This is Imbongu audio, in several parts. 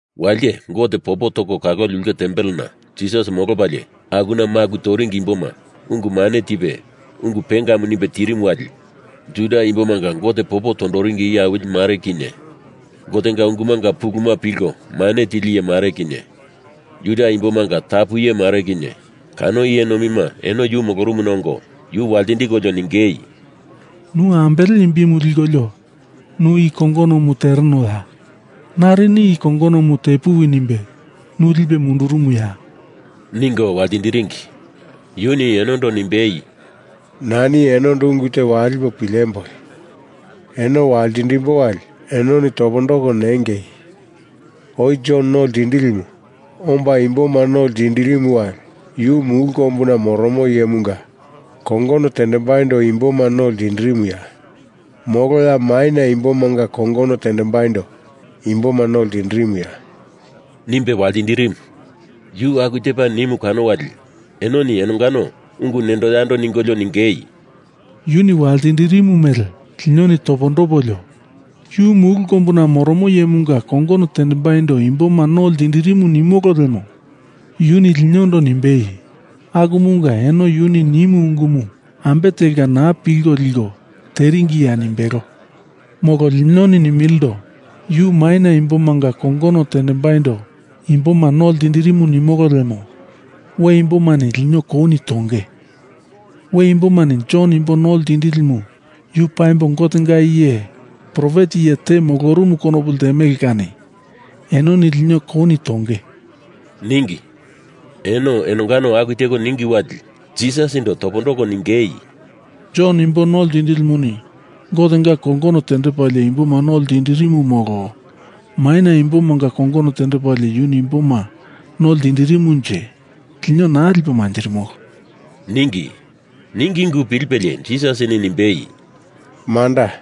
Walite Gote popo toko kaloli ulke tempelena Jisas molopalie akuna maku toringi imboma ungu mane tipe, ungu pengamu nimbe tirimu wali Juda imbomanga Gote popo tondoringi iye awili mare kinye, Gotenga ungumanga pulumu pilko mane tili iye mare kinye, Juda imbomanga tapu iye mare kinye, kano iye nomima eno yu molorumuna ongo yu waltindikolio ningei, “Nu ambele imbimu likolio nu i kongonomu terenoya? Narini i kongonomu tepuwi nimbe nu lipe mundurumuya?” ningo waltindiringi. Yuni enondo nimbei, “Nani enondo ungu te walipo pilemboi! Eno waltindimbo wali enoni topondoko nengei! Oi Jon No Ltindilimu omba imboma no ltindirimu wali yu mulu kombuna moromo iyemunga kongono tendembaindo imboma no ltindirimuya? Molo ya maina imbomanga kongono tendembaindo imboma no ltindirimuya?” nimbe waltindirimu. Yu aku tepa nimu kano wali enoni enongano ungu nendo yando ningolio ningei, “Yuni waltindirimu mele linoni topondopolio, Yu mulu kombuna moromo iyemunga kongono tendembaindo imboma no ltindirimu nimolo lemo yuni linondo nimbei, akumunga eno yuni nimu ungumu ambe telka naa pilko liko teringiya nimbelo. Molo linoni nimilindo, yu maina imbomanga kongono tendembaindo imboma no ltindirimu nimolo lemo we imbomani lino kouni tonge. We imbomani Jon Imbo No Ltindilimu yu paimbo Gotenga iye profet iye te molorumu konopu ltemele kani enoni lino kouni tonge,” ningi. Eno enongano aku teko ningi wali Jisasindo topondoko ningei, “Jon Imbo No Ltindilimuni Gotenga kongono tendepalie imboma no ltindirimu, molo maina imbomanga kongono tendepalie yuni imboma no ltindirimunje lino naa lipo manjirimolo,” ningi. Ningi ungu pilipelie Jisasini nimbei, “Manda.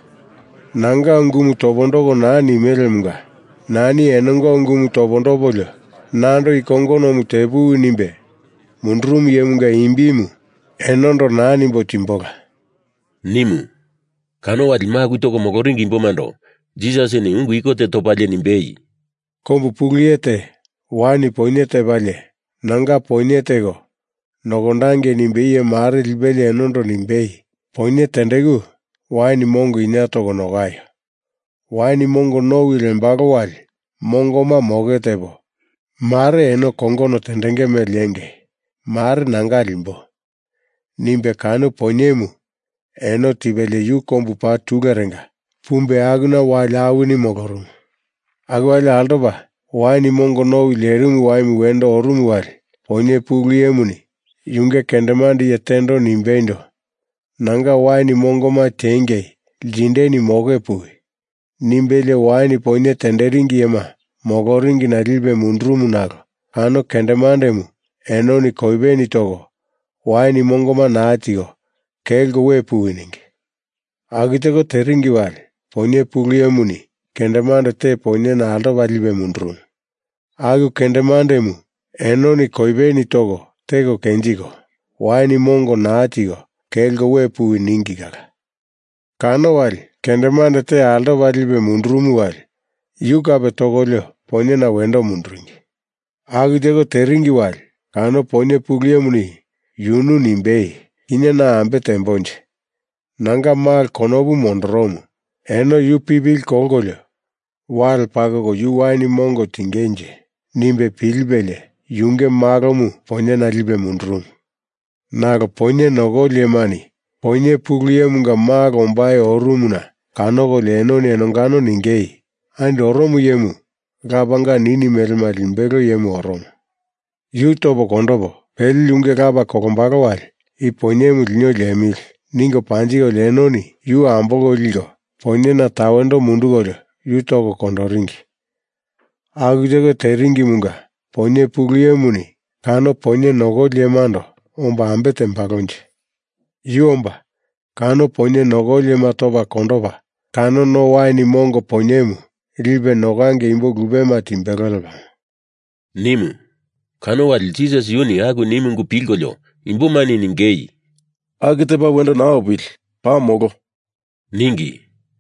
Nanga ungumu topondoko naa nimelemunga nani enonga ungumu topondopolio nando i kongonomu tepuwi nimbe mundurumu iyemunga imbimu enondo naa nimbo timbola,” nimu. Kano wali maku toko moloringi imbomando Jisasini ungu iko te topalie nimbei, “Kombu pulu iye te wain poinye tepalie nanga poinye teko nokondangei nimbe iye mare lipelie enondo nimbei, ‘Poinye tendeku wain mongo inie toko nokaio! Wain mongo nowi lembalo wali mongoma moke tepo, mare eno kongono tendenge mele lenge, mare nanga limbo,’ nimbe kano poinyemu eno tipelie yu kombu paa tulurenga pumbe akuna wali awini molorumu. Aku wali altopa wain mongo nowi lerimu waimu wendo orumu wali poinye pulu iyemuni yunge kendemande iye tendo nimbeindo, ‘Nanga wain mongoma tiengei ltindeni moke puwi,’ nimbelie wain poinye tenderingi iyema moloringina lipe mundurumu nalo kano kendemandemu enoni koipeni toko, wain mongoma naa tiko, kelko we puwi ningi. Aku teko teringi wali poinye pulu iyemuni kendemande te poinyena altopa lipe mundurumu. Aku kendemandemu enoni koipeni toko, teko kenjiko, wain mongo naa tiko, kelko we puwi ningi kala. Kano wali kendemande te altopa lipe mundurumu wali yu kape tokolio poinyena wendo munduringi. Aku teko teringi wali kano poinye pulu iyemuni yunu nimbei, ‘Kinye na ambe teambonje? Nanga malo konopu mondoromu, eno yu pipili kolkolio wale pakoko yu wain mongo tingenje,’ nimbe pilipelie yunge malomu poinyena lipe mundurumu. Nalo poinye nokoli iyemani poinye pulu iyemunga malo ombai orumuna kanokolio enoni enongano ningei, ‘Andi oromo iyemu lapanga nini melema limbelo iyemu oromo. Yu topo kondopo, pele yunge lapa kolombalo wali i poinyemu lino liemili,’ ningo panjikolio enoni yu ambolko liko poinyena tawendo mundukolio yu toko kondoringi. Aku teko teringimunga poinye pulu iyemuni kano poinye nokoli iyemando omba ambe tembalonje? Yu omba kano poinye nokoli iyema topa kondopa kano no wain mongo poinyemu lipe nokangei imbo lupema timbelo lepamo,” nimu. Kano wali Jisas yuni aku nimu ungu pilkolio imbomani ningei, “Aku tepa wendo naa opili, paa molo,” ningi.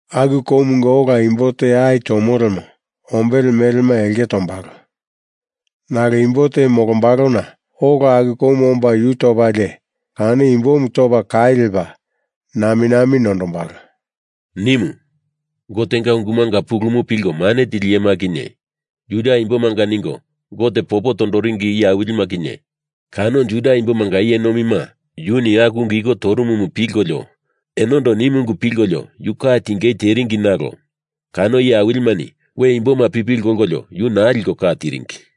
Aku koumunga ola imbo te ai tomo lemo ombele melema elke tombalo. Nalo imbo te molombalona ola aku koumu omba yu topalie kano imbomu topa kai lepa naminami nondombalo,” nimu. Gotenga ungumanga pulumu pilko mane tili iyema kinye, Juda imbomanga ningo Gote popo tondoringi iye awilima kinye, kano Juda Imbomanga iye nomima yuni aku ungu iko torumumu pilkolio enondo nimu ungu pilkolio yu ka tingei teringi nalo kano iye awilimani we imboma pipili kolkolio yu naa liko ka tiringi.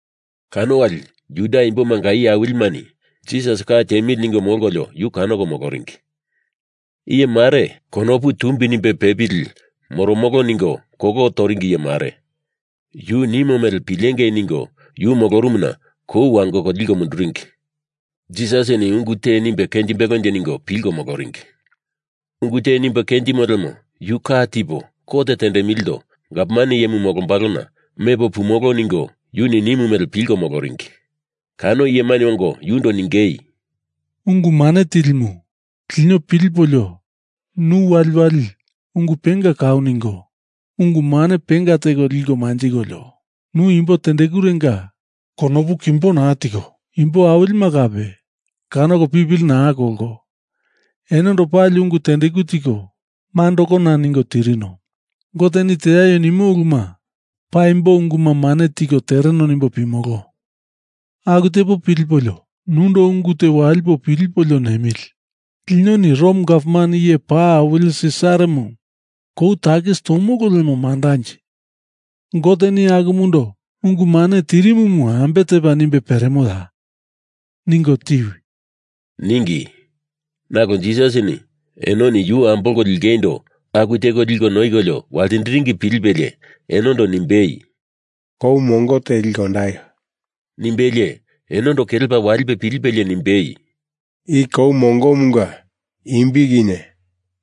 Kano wali Juda imbomanga iye awilimani Jisas ka tiemili ningo molkolio yu kanoko moloringi. Iye mare, konopu tumbi nimbe pepili moromolo ningo kolo toringi iye mare, yu nimo mele pilengei ningo yu molorumuna kou wangoko liko munduringi. Jisasini ungu te nimbe kenjimbelonje ningolio pilko moloringi. Ungu te nimbe kenjimo lemo yu ka tipo kot tendemilindo gavman iyemu molombalona mepo pumolo ningo yuni nimu mele pilko moloringi. Kano iyemani ongo yundo ningei, “Ungu Mane Tilimu, lino pilipolio nu waliwali ungu penga kau ningo, ungu mane penga teko liko manjikolio, nu imbo tendekurenga konopu kimbo naa teko, imbo awilima kape kanoko pipili naa kolko, enondo pali ungu tendeku tiko mandakona ningo tirino. Goteni teaio nimo uluma paimbo unguma mane tiko tereno nimbo pimolo. Aku tepo pilipolio nundo ungu te walipo pilipolio nemili! Linoni Rom Gavman Iye Paa Awili Sisaramu kou takis tomolo lemo mandanje? Goteni akumundo ungu mane tirimumu ambe tepa nimbe peremoya? Ningo tiwi,” ningi. Nalo Jisasini enoni yu ambolko lingeindo aku teko liko noikolio waltindiringi pilipelie enondo nimbei, “Kou mongo te liko ondaio,” nimbelie enondo kelepa walipe pilipelie nimbei, “I kou mongomunga imbi kinye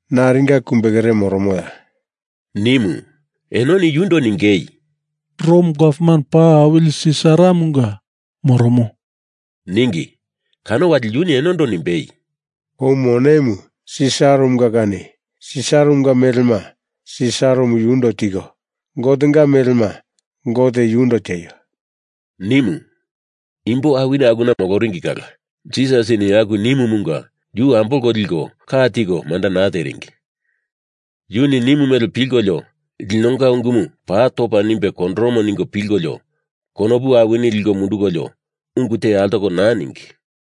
naringa kumbekere moromoya?” nimu. Enoni yundo ningei, “Rom Gavman Paa Awili Sisaramunga moromo,” ningi. Kano wali yuni enondo nimbei, “Kou monemu Sisaramunga kani Sisaramunga melema Sisaramu yundo tiko, Gotenga melema Gote yundo tieio,” nimu. Imbo awini akuna moloringi kala Jisasini aku nimumunga yu ambolko liko ka tiko manda naa teringi. Yuni nimu mele pilkolio linonga ungumu paa topa nimbe kondoromo ningo pilko konopu awini liko mundukolio ungu te altoko naa ningi.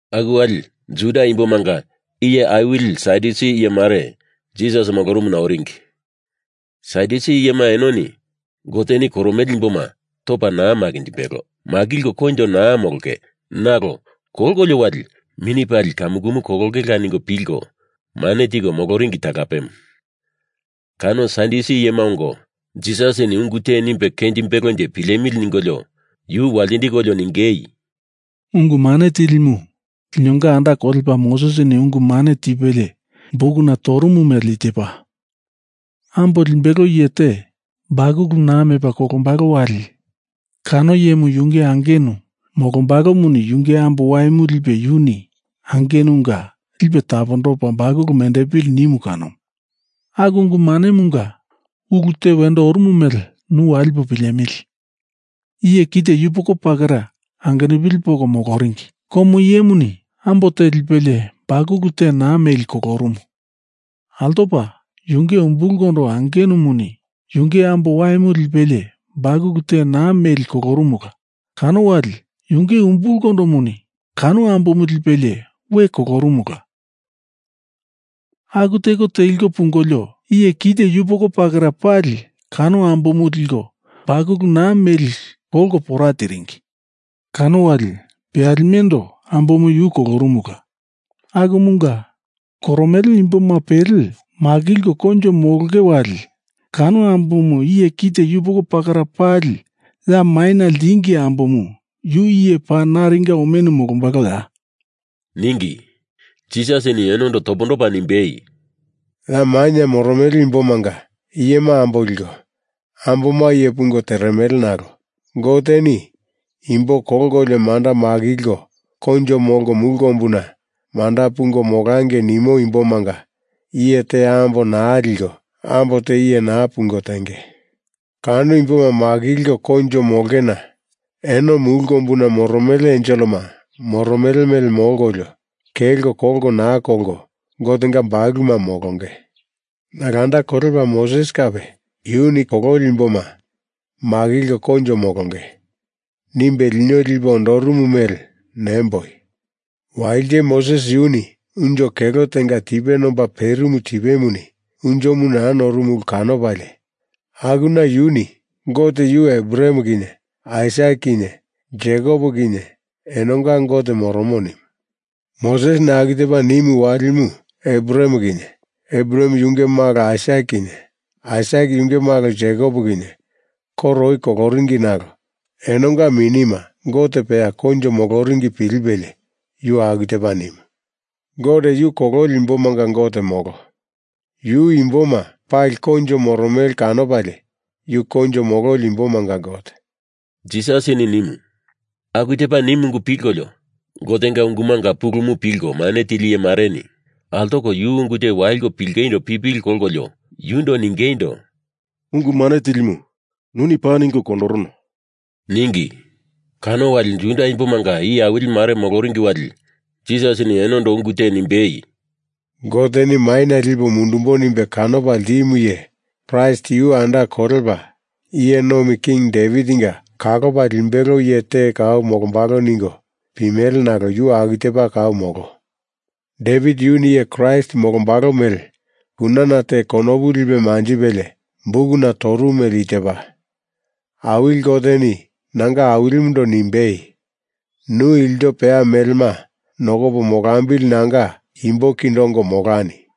Aku wali Juda imbomanga iye awili Sadyusi iye mare Jisas molorumuna oringi. Sadyusi iyema eno Goteni koromele imboma topa naa makinjimbelo, makilko koinjo naa molonge nalo kolkolio wali mini pali kamukumu kolongela ningo pilko mane tiko moloringi talapemu. Kano Sadyusi iyema ongo Jisasini ungu te nimbe kenjimbelonje pilemili ningolio yu waltindikolio ningei, “Ungu Mane Tilimu, linonga anda kolepa Mosesini ungu mane tipelie bukuna torumu mele i tepa: Ambo limbelo iye te bakulu naa mepa kolombalo wali kano iyemu yunge angenu molombalomuni yunge ambo waimu lipe yuni angenunga lipe tapondopa bakulu mendepili nimu kanomu. Aku ungu manemunga ulu te wendo orumu mele nu walipo pilemili! Iye kite yupoko pakara angenupili poko moloringi. Komo iyemuni ambo te lipelie bakulu te naa meli kolorumu. Altopa yunge umbulkondo angenumuni yunge ambo waimu lipelie bakulu te naa meli kolorumula kano wali yunge umbulkondomuni kano ambomu lipelie we kolorumula. Aku teko teliko pungolio iye kite yupoko pakara pali kano ambomu liko bakulu naa meli kolko pora tiringi. Kano wali peyalimendo ambomu yu kolorumula. Akumunga, koromele imboma pele makilko koinjo molonge wali kano ambomu iye kite yupoko pakara pali ya maina ltingi ambomu yu iye paa naringa omenu molombaloya?” ningi. Jisasini enondo topondopa nimbei, “Ya maina moromele imbomanga iyema ambo liko, amboma iye pungo teremele nalo Goteni imbo kolkolio manda makilko koinjo molko mulu kombuna manda pungo molangei nimo imbomanga iye te ambo naa liko ambo te iye naa pungo tenge. Kano imboma makilko koinjo molongena eno mulu kombuna moromele enselema moromele mele molkolio, kelko kolko naa kolko Gotenga bakuluma molonge. Nalo anda kolepa Moses kape yuni kololi imboma makilko koinjo molonge. nimbe lino lipe ondorumu mele nemboi. Walite Moses yuni unjo kelo tenga tipe nomba perimu tipemuni unjomu naa norumu ulu kanopalie, akuna yuni Gote yu Abraham kinye, Aisak kinye, Jekop kinye enonga Gote moromo nimu. Mosesini aku tepa nimu walimu Abraham kinye, Abraham yunge malo Aisak kinye, Aisak yunge malo Jekop kinye koro oi koloringi nalo enonga minima Gote peya koinjo moloringi pilipelie yu aku tepa nimu. Gote yu kololi imbomanga Gote molo. Yu imboma pali koinjo moromele kanopalie yu koinjo mololi imbomanga Gote,” Jisasini nimu. Aku tepa nimu ungu pilkolio Gotenga ungumanga pulumu pilko mane tili iye mareni altoko yu ungu te waliko pilingeindo pipili kolkolio yundo ningeindo, “Ungu Mane Tilimu, nuni paa ningo kondorono,” ningi. Kano wali Juda Imbomanga iye awili mare moloringi wali Jisasini enondo ungu te nimbei, “Goteni maina lipo mundumbo nimbe kanopa ltimu iye Kraist yu anda kolepa Iye Nomi King Devitinga kalopa limbelo iye te kau molombalo ningo pimele nalo yu aku tepa kau molo. Devit yuni iye Kraist molombalo mele kunana te konopu lipe manjipelie bukuna torumu mele i tepa: Awili Goteni nanga Awilimundo nimbei, ‘Nu ilto peya melema nokopo molambili nanga imbo kindo ongo molani!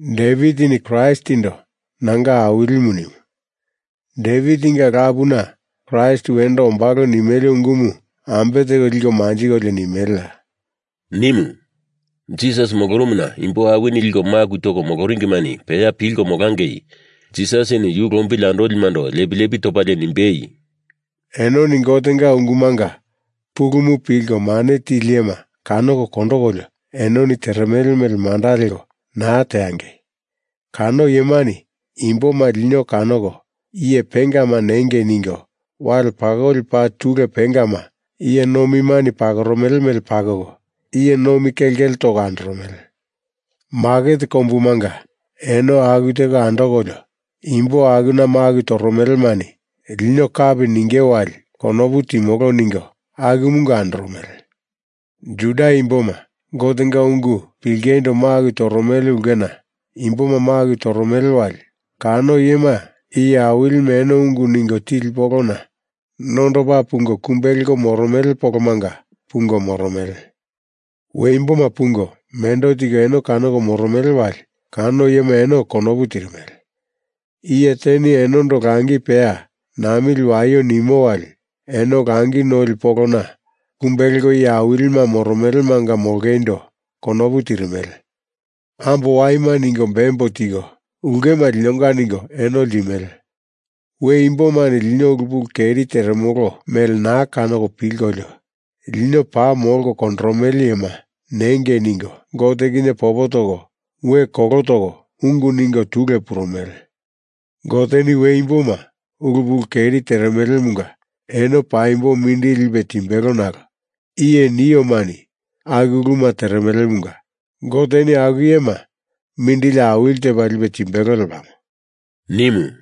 Devitini Kraistindo nanga Awilimu nimu. Devitinga lapuna Kraist wendo ombalo nimele ungumu ambe teko liko manjikolio nimeleya,” nimu. Jisas molorumuna imbo awini liko maku toko moloringimani peya pilko molangei Jisasini yu lombili andolimando lepi lepi topalie nimbei, “Enoni Gotenga ungumanga pulumu pilko mane tili iyema kanoko kondokolio enoni teremele mele manda leko naa teangei! Kano iyemani imboma lino kanoko iye pengama nengei ningo wale pakoli paa tule pengama, iye nomima pakoromele mele pakoko, iye nomi kelkele toko andoromele. Maket kombumanga eno aku teko andokolio imbo akuna maku toromelemani lino kapi ninge wali konopu timolo ningo akumanga andoromele. Juda imboma Gotenga ungu pilingeindo maku toromele ulkena imboma maku toromele wali kano iyema iye awilima eno ungu ningo tili polona nondopa pungo kumbe leko moromele polomanga pungo moromele. We imboma pungo mendo tiko eno kanoko moromele wali kano iyema eno konopu tirimele. Iye teni enondo langi peya namili waio nimo wali eno langi noli polona kumbe leko iye awilima moromelemanga molongeindo konopu tirimele. Ambo waima ningo bembo tiko ulkema linonga ningo eno ltimele. We imbomani lino ulu pulu keri teremolo mele naa kanoko pilkolio, lino paa molko kondoromele iyema nengei ningo Gote kinye popo toko, we kolo toko ungu ningo tule purumele. Goteni we imboma ulu pulu keri teremelemunga eno paimbo mindili lipe timbelo nalo i iye niomani aku uluma teremelemunga Goteni aku iyema mindili awili tepa lipe timbelo lepamo,” nimu.